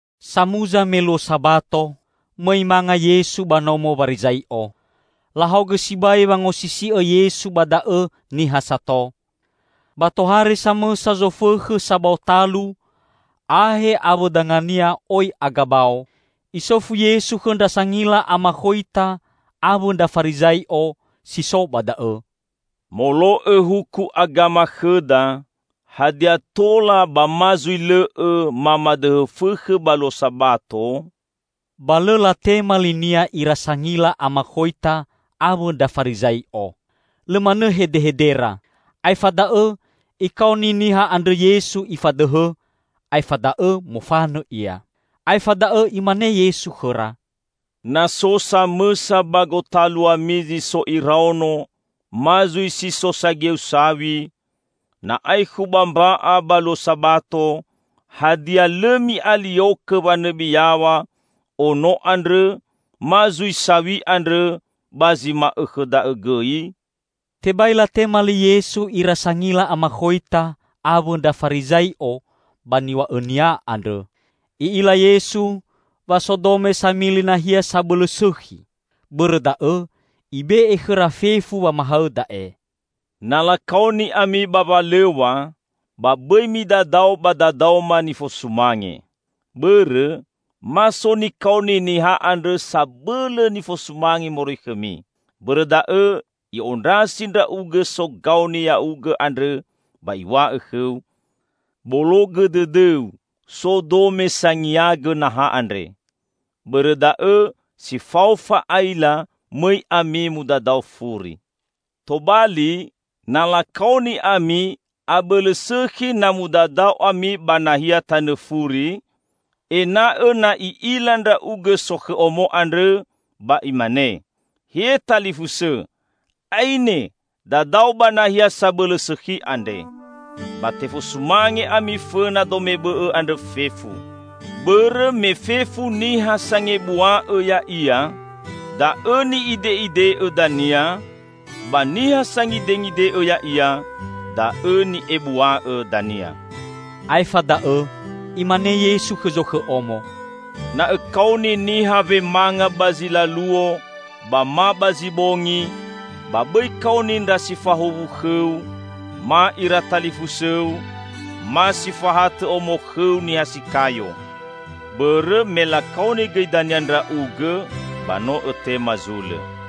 Samuza me luo Sabato, mõi manga Yesu ba nomo Warizai'o. Lahaogõ sibai wangosisi'õ Yesu ba da'õ niha sato. Ba tohare samõsa zofõkhõ sabao talu, ahe awõ dangania oi agabao. Isofu Yesu khõ ndra sangila amakhoita awõ ndra Farizai'o si so ba da'õ, "Molo'õ huku agama khõda, hadia tola ba ma zui lõ'õ mamadõhõ fõkhõ ba luo Sabato?" Ba lõ latema li-Nia ira sangila amakhoita awõ ndra Farizai'o. Lõ manõ hedehedera. Aefa da'õ Ikaoni niha andrõ Yesu Ifadõhõ, aefa da'õ mofanõ ia. Aefa da'õ Imane Yesu khõra, "Na so samõsa ba gotaluami zi so iraono ma zui si so sageu saw̃i, na aekhu ba mba'a ba luo Sabato, hadia lõ mi'aliokõ wanõbi yaw̃a ono andrõ ma zui saw̃i andrõ ba zi ma'õkhõ da'õ gõi?" Tebai latema li Yesu ira sangila amakhoita awõ ndra Farizai'o ba niw̃a'õnia andrõ. I'ila Yesu wa so dome samili nahia sabõlõ sõkhi. Bõrõ da'õ Ibe'e khõra fefu wamahaõ da'e. "Na lakaoni ami ba walõw̃a, ba bõi midadao ba dadaoma nifosumange. Bõrõ, ma so nikaoni niha andrõ sabõlõ nifosumange moroi khõmi. Bõrõ da'õ i'ondrasi ndra'ugõ sogaoni ya'ugõ andrõ ba iw̃a'õ khõu, 'Bologõ dõdõu, so dome sangiagõ naha andre.' Bõrõ da'õ si fao fa'aila mõi ami mudadao furi. Tobali, na lakaoni ami, abõlõ sõkhi na mudadao ami ba nahia tanõ furi; ena'õ na i'ila ndra'ugõ sokhõ omo andrõ ba imane, 'He talifusõ, aine, dadao ba nahia sabõlõ sõkhi andre.' Ba tefosumange ami fõna dome bõ'õ andrõ fefu. Bõrõ me fefu niha sangebua'õ ya'ia, da'õ ni'ide'ide'õ dania, ba niha sangidengide'õ ya'ia, da'õ ni'ebua'õ dania." Aefa da'õ Imane Yesu khõ zokhõ omo, "Na õkaoni niha wemanga ba zi laluo ba ma ba zi bongi, ba bõi kaoni ndra si fahuwu khõu ma ira talifusõu, ma si fahatõ omo khõu niha si kayo. Bõrõ me lakaoni gõi dania ndra'ugõ, ba no õtema zulõ.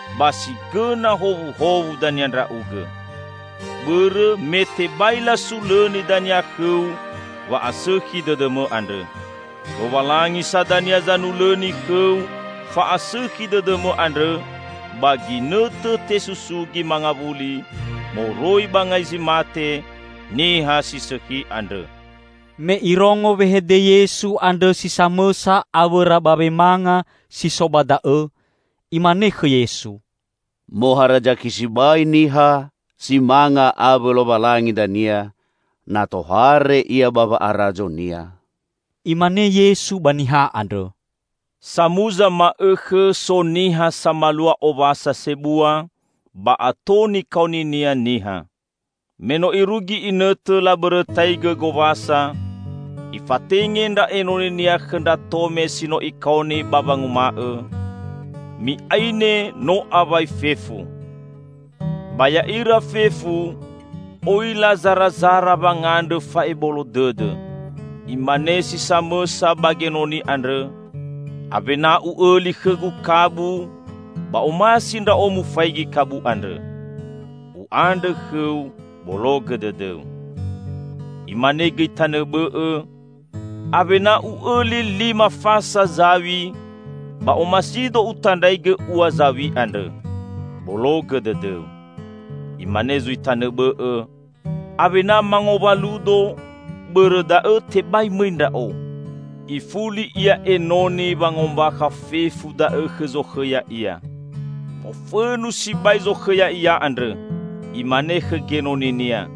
ba si gõna howuhowu dania ndra'ugõ. Bõrõ me tebai lasulõni dania khõu wa'asõkhi dõdõmõ andrõ. Lowalangi sa dania zanulõni khõu fa'asõkhi dõdõmõ andrõ ba ginõtõ tesusugi mangawuli moroi ba ngai zi mate niha si sõkhi andrõ." Me irongo wehede Yesu andrõ si samõsa awõra ba wemanga si so ba da'õ, imane khõ Yesu, "Moharazaki sibai niha si manga awõ Lowalangi dania na tohare Ia ba wa'arazo-Nia!" Imane Yesu ba niha andrõ, "Samuza ma'õkhõ so niha samalua owasa sebua, ba ato nikaoninia niha. Me no irugi inõtõ labõrõtaigõ gowasa, ifatenge ndra enoninia khõ ndra tome si no ikaoni ba wanguma'õ, 'Mi'aine, no awai fefu.' Ba ya'ira fefu, oi lazarazara wangandrõ fa'ebolo dõdõ. Imane si samõsa ba genoni andrõ, 'Awena u'õli khõgu kabu, ba omasi ndra'o mufaigi kabu andrõ. U'andrõ khõu bologõ dõdõu.' Imane gõi tanõ bõ'õ, 'Awena u'õli lima fasa zaw̃i, ba omasido utandraigõ ua zaw̃i andrõ. Bologõ dõdõu.' Imane zui tanõ bõ'õ, 'Awena mangowaludo, bõrõ da'õ tebai mõi ndra'o.' Ifuli ia enoni wangombakha fefu da'õ khõ zokhõ ya'ia. Mofõnu sibai zokhõ ya'ia andrõ. Imane khõ genoninia,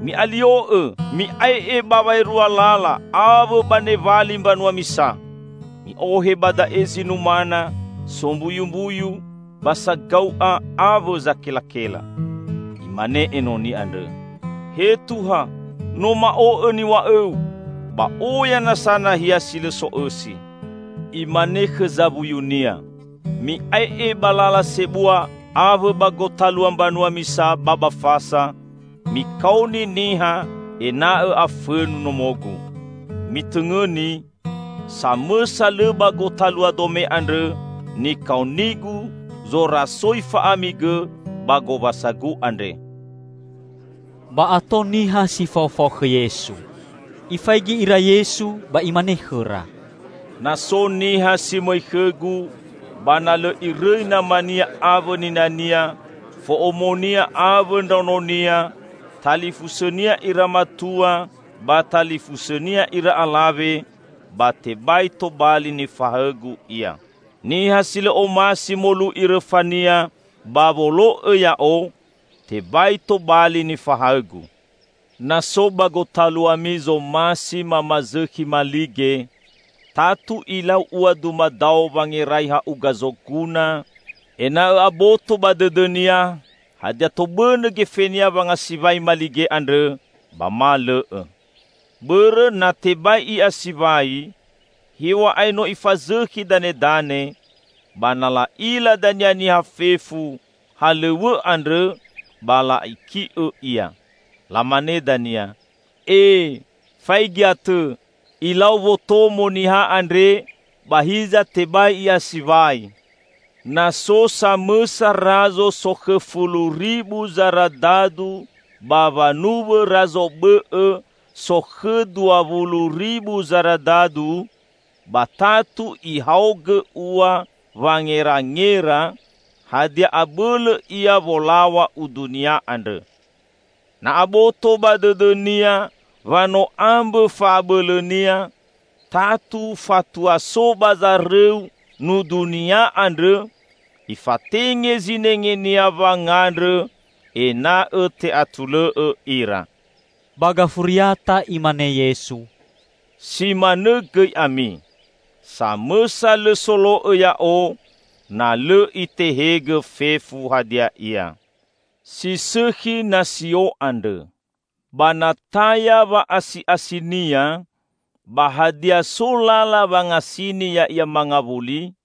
'Mi'alio'õ, mi'ae'e ba waerua lala awõ ba newali mbanua misa. Mi'ohe ba da'e zi numana, sombuyumbuyu, ba sagau'a awõ zakelakela.' Imane enoni andrõ, 'He Tuha, no ma'o'õ niw̃a'õu, ba oya nasa nahia si lõ so'õsi.' Imane khõ zawuyunia, 'Mi'ae'e ba lala sebua awõ ba gotalua mbanua misa ba ba fasa, mikaoni niha ena'õ afõnu nomogu. Mitõngõni! Samõsa lõ ba gotalua dome andrõ nikaonigu zorasoi fa'ami gõ ba gowasagu andre!'" Ba ato niha si faofao khõ Yesu. Ifaigi ira Yesu ba Imane khõra, "Na so niha si mõi khõ-Gu, ba na lõ irõi namania awõ ninania, fo'omonia, awõ ndraononia, talifusõnia ira matua, ba talifusõnia ira alawe, ba tebai tobali nifahaõ-Gu ia. Niha si lõ omasi molu'i rõfania ba wolo'õ Ya'o, tebai tobali nifahaõ-Gu. Na so ba gotaluami zomasi mamazõkhi malige, tatu ilau ua dumadao wangerai ha'uga zoguna, ena'õ aboto ba dõdõnia hadia tobõnõ gefenia wangasiwai malige andrõ ba ma lõ'õ. Bõrõ na tebai i'asiwai, hew̃a'ae no ifazõkhi danedane, ba na la'ila dania niha fefu halõw̃õ andrõ ba la'iki'õ ia. Lamane dania, 'E, faigi atõ, ilau wotomo niha andre, ba hiza tebai i'asiwai!' Na so samõsa razo sokhõ fulu ribu zaradadu ba wanuwõ razo bõ'õ sokhõ dua wulu ribu zaradadu, ba tatu ihaogõ ua wangerangera hadia abõlõ ia wolaw̃a udunia andrõ. Na aboto ba dõdõnia wa no ambõ fa'abõlõnia, tatu fatua so ba zarõu nudunia andrõ, ifatenge zinengenia wangandrõ ena'õ te'atulõ'õ ira." Ba gafuriata Imane Yesu, "Si manõ gõi ami. Samõsa lõ solo'õ Ya'o na lõ Itehegõ fefu hadia ia." "Si sõkhi nasio andrõ. Ba na taya wa'asi'asinia, ba hadia so lala wangasini ya'ia mangawuli?